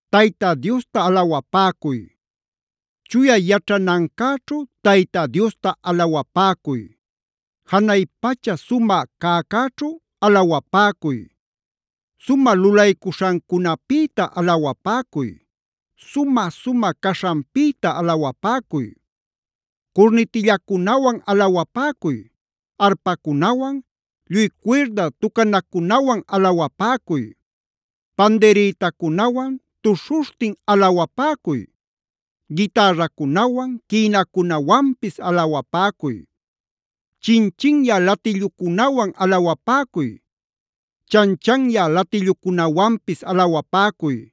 ¡Tayta Diosta alawapäcuy! Chuya yaćhanancäćhu Tayta Diosta alawapäcuy. Janay pacha sumä cäcäćhu alawapäcuy. Sumä lulaycuśhancunapïta alawapäcuy. Sumä-sumä caśhanpïta alawapäcuy. Curnitillacunawan alawapäcuy. Arpacunawan, lluy cuirda tucanacunawan alawapäcuy. Pandirïtacunawan tuśhuśhtin alawapäcuy. Gitarracunawan, quïnacunawanpis alawapäcuy. Chin-chinyä latillucunawan alawapäcuy. Chan-chanyä latillucunawanpis alawapäcuy.